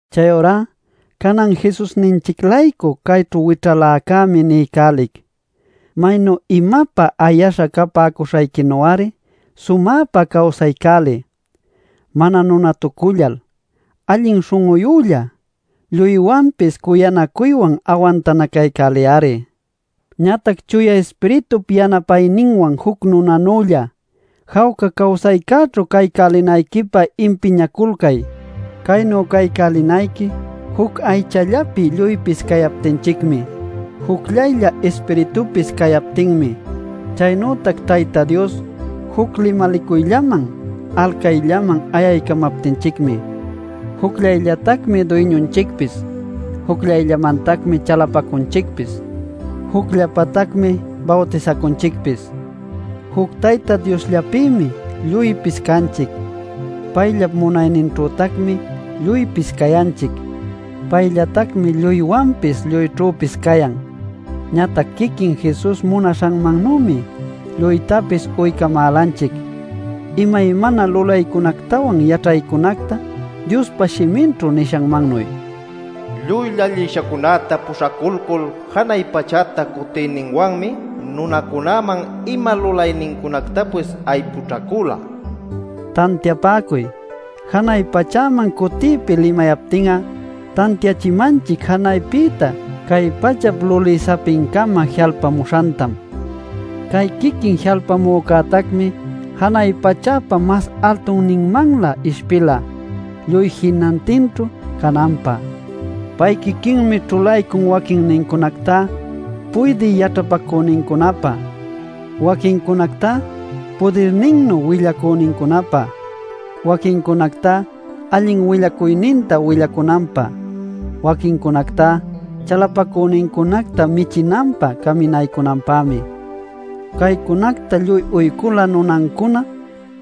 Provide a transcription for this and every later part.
Chayurá canan Jesusninchic-laycu cayćhu wićhaläcämi niycälic, maynu imapä ayaśha capäcuśhayquinu-ari sumäpa cawsaycäliy. Mana nunatucullal, allin śhun'uyülla, lluywanpis cuyanacuywan awantanacaycäliy-ari. Ñatac Chuya Ispiritup yanapayninwan juc nunanülla, jawca cawsaycäćhu caycälinayquipä impiñaculcay. Caynu caycälinayqui juc aychallapi lluypis cayaptinchicmi, jucllaylla Ispiritupis cayaptinmi, chaynütac Tayta Dios juc limalicuyllaman alcayllaman ayamaptinchicmi. Jucllayllatacmi Duyñunchicpis, jucllamantacmi chalapacunchicpis, jucllapatacmi bawtisacunchicpis. Juc Tayta Diosllapïmi lluypis canchic; payllap munayninćhütacmi lluypis cayanchic. Payllatacmi lluywanpis lluyćhüpis cayan. Ñatac quiquin Jesus munaśhanmannümi lluytapis uycamälanchic imaymana lulaycunactawan yaćhaycunacta Diospa shiminćhu nishanmannuy: “Lluy llallishancunäta puśhaculcul janay pachäta cutiyninwanmi nunacunäman ima lulaynincunactapis aypućhacula” nil. (Tantiapäcuy: Janay pachäman cutiypi limayaptin'a tantiachimanchic janaypïta cay pachap luli sapincama ji'alpamuśhantam. Cay quiquin ji'alpamücätacmi janay pachäpa mas altunninmanlä ishpila lluy jinantinćhu cananpä.) Pay quiquinmi ćhulaycun waquincunactá puydï yaćhapacünincunapä, waquincunactá pudirninnu willacünincunapä, waquincunactá allin willacuyninta willacunanpä, waquincunactá chalapacünincunacta michinanpä caminaycunanpämi. Caycunacta lluy uycula nunancuna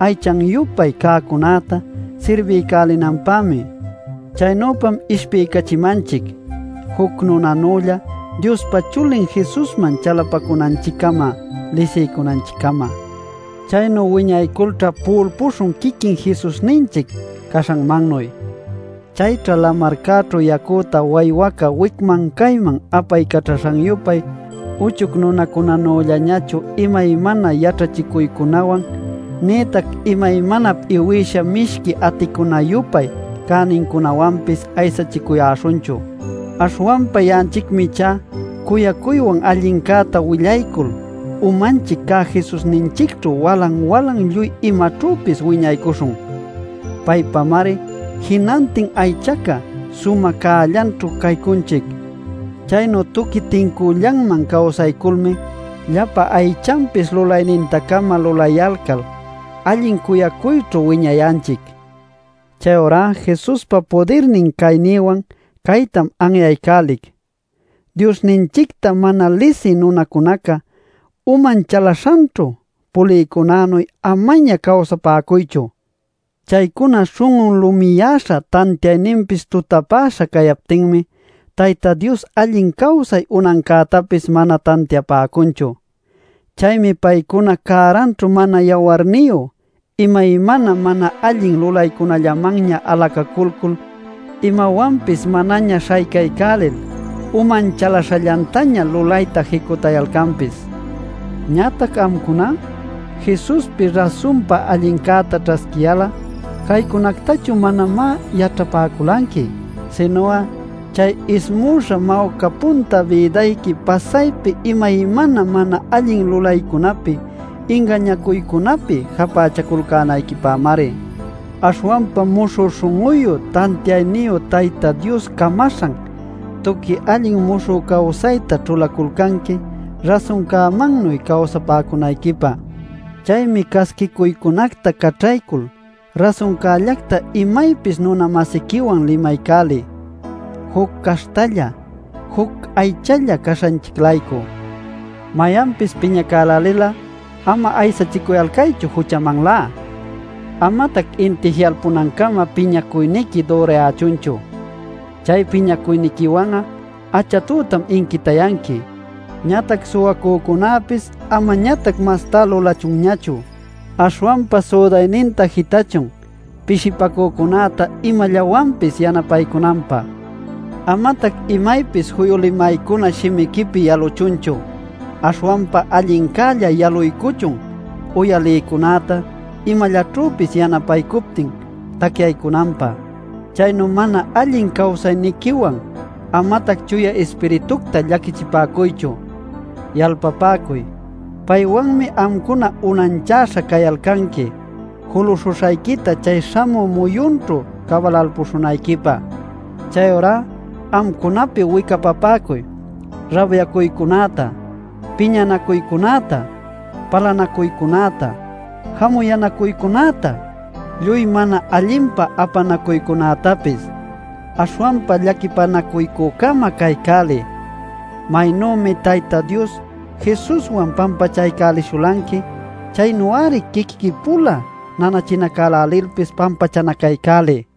aychan-yupay cäcunäta sirbiycälinanpämi. Chaynüpam ishpiycachimanchic juc nunanülla Diospa Chulin Jesusman chalapacunanchiccama lisiycunanchiccama. Chaynu wiñayculćha pu'ulpuśhun quiquin Jesusninchic caśhanmannuy. Chayćha lamarcäćhu yacüta waywaca wicman cayman apaycaćhaśhan-yupay uchuc nunacunänüllañachu imaymana yaćhachicuycunawan nïtac imaymanap iwïsha mishqui aticuna-yupay cänincunawanpis aysachicuyäśhunchu. Aśhwanpa ya'anchicmi ichá cuyacuywan allincäta willaycul umanchic cä Jesusninchicćhu walan-walan lluy imaćhüpis wiñaycuśhun. Paypamari jinantin aychaca sumä cällanćhu caycunchic. Chaynu tuqui tincüllanman cawsayculmi llapa aychanpis lulayninta-cama lulayalcal allin cuyacuyćhu wiñayanchic. Chayurá Jesuspa pudirnin caynïwan caytam anyaycälic: Diosninchicta mana lisï nunacunaca uman chalaśhanćhu pulïcunänuy amaña cawsapäcuychu. Chaycuna śhun'un lumiyäśha tantiayninpis tutapäśha cayaptinmi Tayta Dios allin cawsay unancätapis mana tantiapäcunchu. Chaymi paycuna cäranćhu mana yawarniyu, imaymana mana allin lulaycunällamanña alacaculcul, imawanpis manaña śhaycaycälil, uman chalaśhallantaña lulayta jicutayalcanpis. Ñatac amcuná Jesuspi rasunpa allincäta ćhasquiyal'a caycunactachu manamá yaćhapäculanqui. Sinu'a chay ismüśha mawca punta bïdayqui pasaypi imaymana mana allin lulaycunäpi ingañacuycunapi japächaculcänayquipämari. Aśhwanpam muśhü śhun'uyu tantiayniyu Tayta Dios camaśhan tuqui allin muśhü cawsayta ćhulaculcanqui rasuncämannuy cawsapäcunayquipä. Chaymi casquicuycunacta caćhaycul rasuncällacta imaypis nuna-masiquiwan limaycäliy, juc caśhtalla, juc aychalla caśhanchic-laycu. Mayanpis piñacälälil'a ama aysachicuyalcaychu juchamanlá. Amatac inti ji'alpunancama piñacuyniqui dürayächunchu. Chay piñacuyniquiwan'a achatütam inquitayanqui. Ñatac suwacücunäpis amañatac mastá lulachunñachu. Aśhwanpa südayninta jitachun pishipacücunäta imallawanpis yanapaycunanpä. Amatac imaypis juyu limaycuna shimiquipi yaluchunchu. Aśhwanpa allincälla yaluycuchun uyalïcunäta imallaćhüpis yanapaycuptin tacyaycunanpä. Chaynu mana allin cawsayniquiwan amatac Chuya Ispiritucta llaquichipäcuychu. Yalpapäcuy: paywanmi amcuna unanchäśha cayalcanqui juluśhuśhayquita chay śhamü muyunćhu cabalalpuśhunayquipä. Chayurá amcunapi wicapapäcuy: rabyacuycunäta, piñanacuycunäta, palanacuycunäta, jamuyänacuycunäta, lluy mana allinpa apanacuycunätapis. Aśhwanpa llaquipanacuycü-cama caycäliy. Maynümi Tayta Dios Jesuswan pampachaycälishulanqui, chaynu-ari quiquiqui-pula nanachinacälälilpis pampachanacaycäliy.